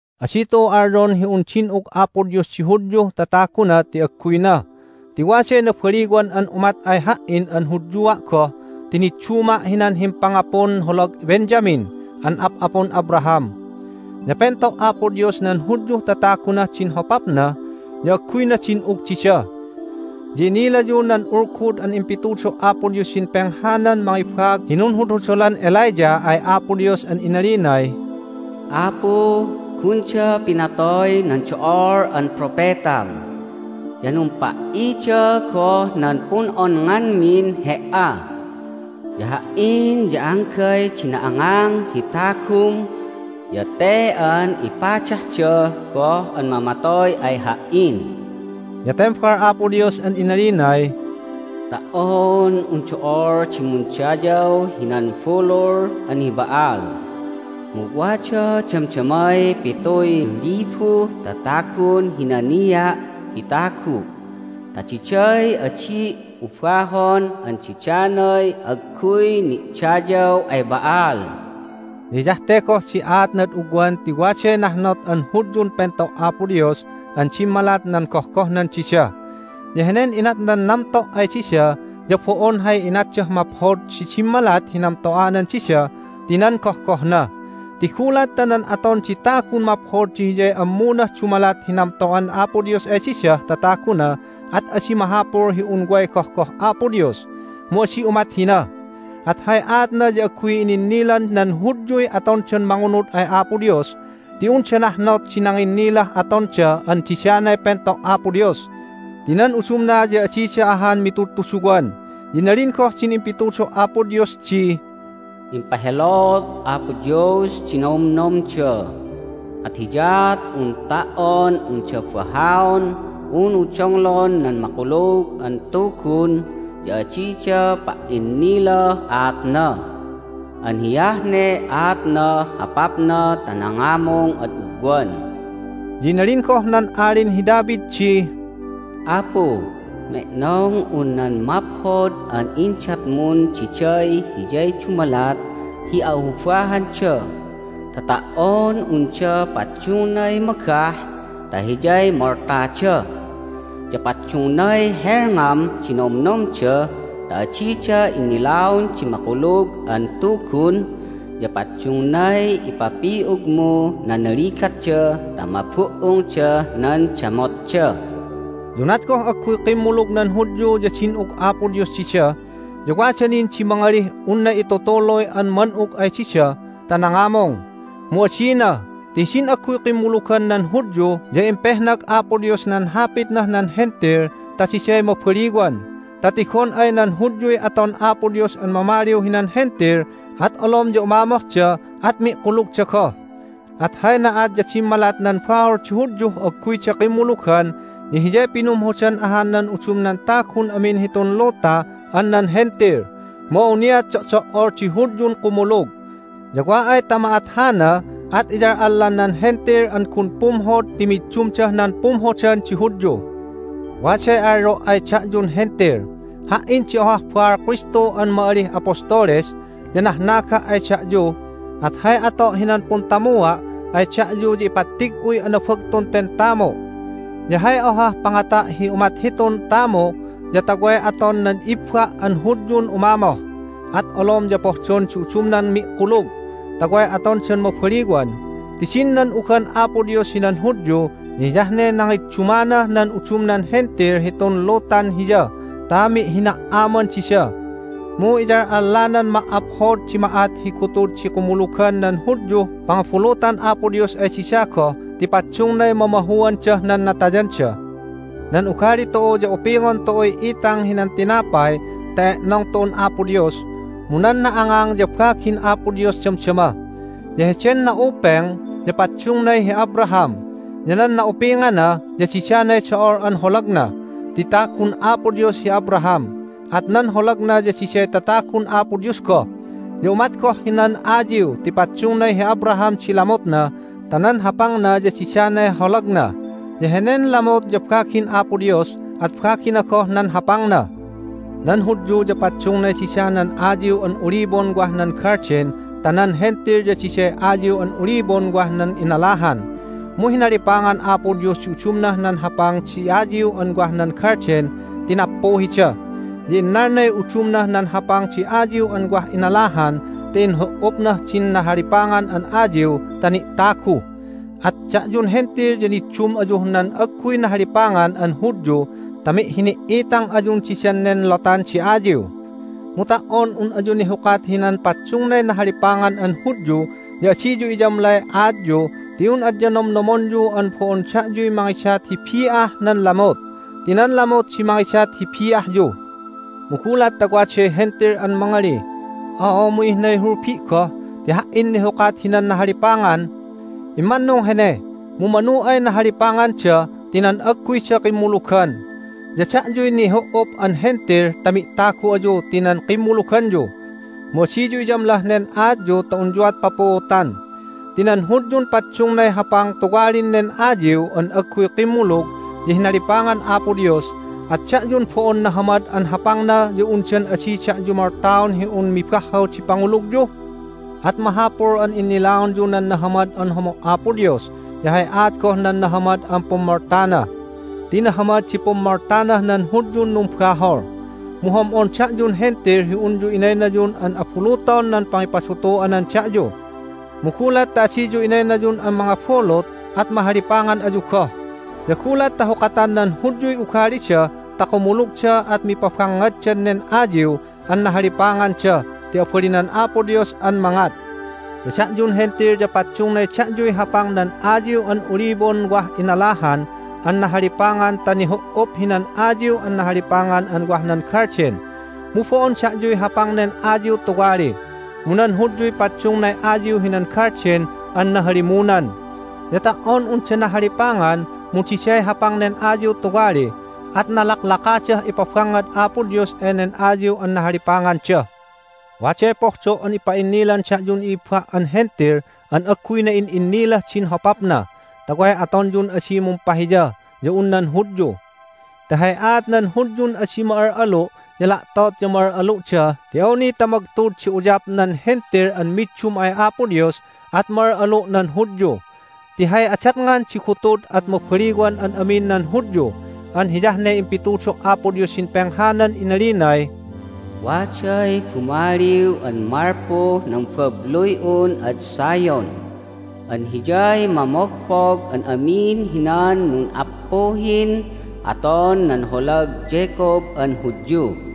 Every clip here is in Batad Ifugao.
Adi tu'u alyon hi un din'ug Apo Dios di Hudyuh tataguna ti agguyna! Ti waday nabaliwan an umat ay ha"in an Hudyua' goh ti nidduma' hinan himpangapun holag Benjamin an ap'apun Abraham. Ya pento' Apo Dios nan Hudyuh tatagunah din hopapna, ya agguyna din'ug dida. Ya inilayu nan ulgud an impitudo' Apo Dios hidin penghanan mangibaag hi nunhudhudolan Elijah ay Apo Dios an inalinay, "Apu, gunda pinatoy nan do'ol an propetam, ya numpa"ida goh nan pun'onnganmin He"a. Ya ha"in ya anggay di na'angang hi tagum, ya te an ipadahda goh an mamatoy ay ha"in!" Ya tembal Apo Dios an inalinay, "Ta"on un do'ol di mundayaw hinan bulul an hi Ba'al mu wada damdamay pituy libuh tatagun hinania' hi tagu' ta diday adi' ubahon an didanay agguy ni'dayaw ay Ba'al." Ya hiyah te goh di aatnad ugwan ti waday nahnot an Hudyun pento' Apo Dios an dimmalat nan gohgohnan dida. Ya henen inatnan namto' ay dida ya bo'on hay inatdah maphod di dimmalat hi namto'anan dida ti nan gohgohna. Ti gulat ta nan aton di tagun maphod di hiyay ammunah dumalat hi namto'an Apo Dios ay didah tataguna at adi mahapul hi un way gohgoh Apo Dios. Mu adi umat hina! At hay aatna ya agguy ininnilan nan Hudyuy atondan mangunud ay Apo Dios, ti unda nahnot di nanginnilah atonda an didanay pento' Apo Dios. Ti nan udumna ya adida ahan mitudtuduwan. Ya inalin goh din impitudo' Apo Dios di, "Impahelot Apo Dios di nomnomda, at hiyaat un ta"on unda bahaon unu donglon nan Makulug an Tugun ya adida pa"innilah aatna. An hiyah ne aatnah hopapna ta nangamung ad ugwan." Ya inalin goh nan Alin hi David di, "Apu, me'nong un nan maphod an indatmun diday hiyay dumalat hi a'ubahanda, ta ta"on unda paddungnay magah ta hiyay moltada! Ya paddungnay helngam di nomnomda ta adida innilaon di Makulug an Tugun, ya paddungnay ipapi'ugmu nan ligatda ta mabu"ungdah nan damotda." Ya unat goh agguy kimmulug nan Hudyu ya din'ug Apo Dios dida, ya wada nin di mangalih unna itutuluy an man'ug ay dida ta nangamung. Mu adina! Ti hidin agguy kimmulugan nan Hudyu ya impehnag Apo Dios nan Hapitnah nan Hentil ta diday mabaliwan, ta tigon ay nan Hudyuy aton Apo Dios an mamaliw hinan Hentil at olom ya umamohda, at mi'kulugda goh. At hay na'at ya dimmalat nan bahol di Hudyuh agguyda kimmulugan ya hiyay pinumhodan ahan nan udumnan tagun amin hitun luta an nan Hentil. Mu awniat do'do"ol di Hudyun kumulug. Ya wa ay ta ma'at hana at iyal'allan nan Hentil an gun pumhod ti middumdah nan pumhodan di Hudyu! Waday alyo' ay da'yun Hentil: Ha"in di ohah baal Kristu an ma'alih apostoles, ya nahnaga' ay da'yu, at hay ato' hinan puntamua' ay da'yu ya ipattig'uy anabagtun ten tamu'. Ya hay ohah pangata' hi umat hitun tamu' ya ta way aton nan i'ibba' an Hudyun umamoh, at olom ya pohdon di udumnan mi'kulug ta way atondan mabaliwan. Ti din nan'ugan Apo Dios hinan Hudyu ya hiyah ne nangiddumanah nan udumnan Hentil hitun lutan Hiya ta mi'hina"aman dida. Mu iyal'allanan ma"aphod di ma'at hi gutud di kumulugan nan Hudyuh pangabulutan Apo Dios ay dida goh ti paddungnay mamahuandah nan natayanda! Nan ugali tu'u ya upingon tu'uy itang hinan tinapay ta e'nong tu'un Apo Dios, mu nan na'angang ya bagin Apo Dios damdama. Ya heden na'upeng ya paddungnay hi Abraham, ya nan na'upingana ya didanay do'ol an holagna. Ti tagun Apo Dios hi Abraham, at nan holagna ya diday tatagun Apo Dios goh. Ya umat goh hinan ayiw ti paddungnay hi Abraham di lamutna ta nan hapangna ya didanay holagna. Ya henen lamut ya bagin Apo Dios, at bagina goh nan hapangna. Nan Hudyu ya paddungnay dida nan ayiw an olibon wah nan galden ta nan Hentil ya diday ayiw an olibon wah nan inalahan. Mu hinalipangan Apo Dios di udumnah nan hapang di ayiw an wah nan galden ti nappuhida, ya innalnay udumnah nan hapang di ayiw an wah inalahan ta inhu"upnah din nahalipangan an ayiw ta ni'tagu. At da'yun Hentil ya niddum ayuh nan agguy nahalipangan an Hudyu ta mi'hini"itang ayun didan nen lotan di ayiw. Mu ta"on un ayu nihukat hinan paddungnay nahalipangan an Hudyu ya adiyu iyamlay aatyu ti un adya nomnomonyu an bo'on da'yuy mangidat hi bi'ah nan lamut, ti nan lamut di mangidat hi bi'ahyu! Mu gulat ta waday Hentil an mangalih, "Oo, mu ihnay hulbi' goh ti ha"in nihukat hinan nahalipangan!" Immannung hene! Mu manu ay nahalipanganda ti nan agguyda kimmulugan, ya da'yuy nihu"up an Hentil ta mi'tagu ayu ti nan kimmuluganyu. Mu adiyu iyamlah nen aatyu ta unyuat papuutan. Ti nan Hudyun paddungnay hapang tuwalin nen ayiw an agguy kimmulug ya hinalipangan Apo Dios. At da'yun bo'on nahamad an hapangna ya undan adi da'yu moltaon hi un mibahhaw di pangulugyu? At mahapul an innilaonyu nan nahamad an homo' Apo Dios ya hay aat goh nan nahamad an pummoltana. Ti nahamad di pummoltanah nan Hudyun numbahol, mu hom'on da'yun Hentil hi unyu inaynayun an abuluton nan pangipadutu'anan da'yu. Mu gulat ta adiyu inaynayun an mangabulut at mahalipangan ayu goh. Ya gulat ta hukatan nan Hudyuy ugalida ta kumulugda at mipabangngaddan nen ayiw an nahalipanganda ti abalinan Apo Dios an mangat. Ya da'yun Hentil ya paddungnay da'yuy hapang nan ayiw an olibon wah inalahan an nahalipangan ta nihu"up hinan ayiw an nahalipangan an wah nan galden. Mu bo'on da'yuy hapang nen ayiw tuwali. Mu nan Hudyuy paddungnay ayiw hinan galden an nahalimunan. Ya ta"on unda nahalipangan mu diday hapang nen ayiw tuwali, at nalaklakadah ipabangngad Apo Dios enen ayiw an nahalipanganda. Waday pohdo' an ipa'innilan da'yun i'ibba' an Hentil an agguy na'in'innilah din hopapna, ta way atonyun adi mumpahiya ya un nan Hudyu. Ti hay aat nan Hudyun adi ma'al'alu' ya la'tot ya ma'al'alu'da ti awni ta magtud di uyap nan Hentil an middum ay Apo Dios at ma'al'alu' nan Hudyu. Ti hay adatngan di gutud at mabaliwan an amin nan Hudyu. An hiyah ne impitudo' Apo Dios hidin penghanan inalinay, "Waday Bumaliw an malpuh nan babluy'un ad Zion, an Hiyay mamogpog an amin hinan nun'appuhin aton nan holag Jacob an Hudyu.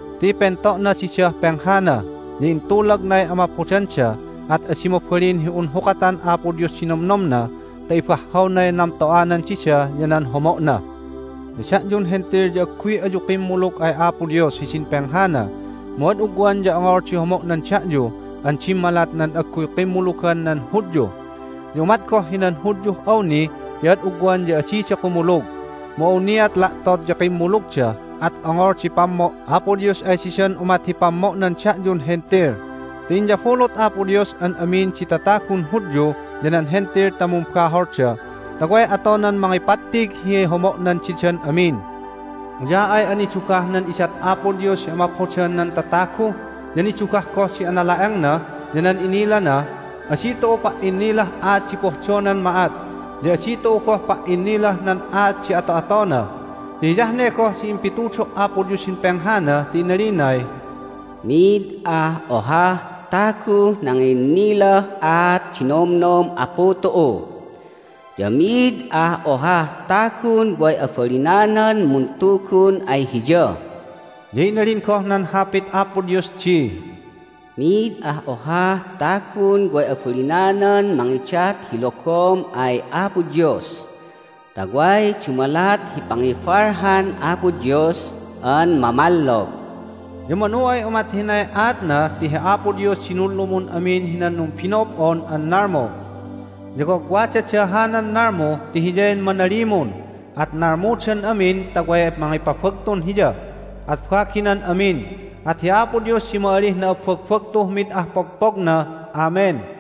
Ti pento'na didah penghana, ya intulagnay amaphodanda, at adi mabalin hi un hukatan Apo Dios di nomnomna ta ibahhawnay namto'anan dida ya nan homo'na. Ya da'yun Hentil ya agguy ayu kimmulug ay Apo Dios hidin penghana. Mu ad ugwan ya ongol di homo'nan da'yu an dimmalat nan agguy kimmulugan nan Hudyu. Ya umat goh hinan Hudyuh awni ti ad ugwan ya adida kumulug. Mu awniat la'tot ya kimmulugda, at ongol di pammo' Apo Dios ay didan umat hi pammo'nan da'yun Hentil. Ti inyabulut Apo Dios an amin di tatagun Hudyu ya nan Hentil ta mumbaholda, ta way atonan mangipattig hi homo'nan didan amin. Uya'ay anidugah nan idat Apo Dios hi amaphodan nan tatagu, ya nidugah goh di anala'engna ya nan inilana! Adi tu'u pa"innilah aat di pohdonan ma'at, ya adi tu'u goh pa"innilah nan aat di ato'atona. Ya hiyah ne goh din impitudo' Apo Dios hidin penghana, ti inalinay, "Mid ah ohah taguh nanginnilah aat di nomnom Apu tu'u, ya mid ah ohah tagun way abalinanan muntugun ay Hiya." Ya inalin goh nan Hapit Apo Dios di, "Mid ah ohah tagun way abalinanan mangidat hi logom ay Apo Dios ta way dumalat hi pangibalhan Apo Dios an mamallog." Ya manu ay umat hinay aatna ti hi Apo Dios di nunlumun amin hinan numbino'ob'on an nalmu. Ya wagwadada hanan nalmu ti Hiyay manalimun, at nalmudan amin ta way mangipabagtun Hiya, at baginan amin. At hi Apo Dios di ma'alih na'abbagbagtuh mid ah pogpogna! Amen!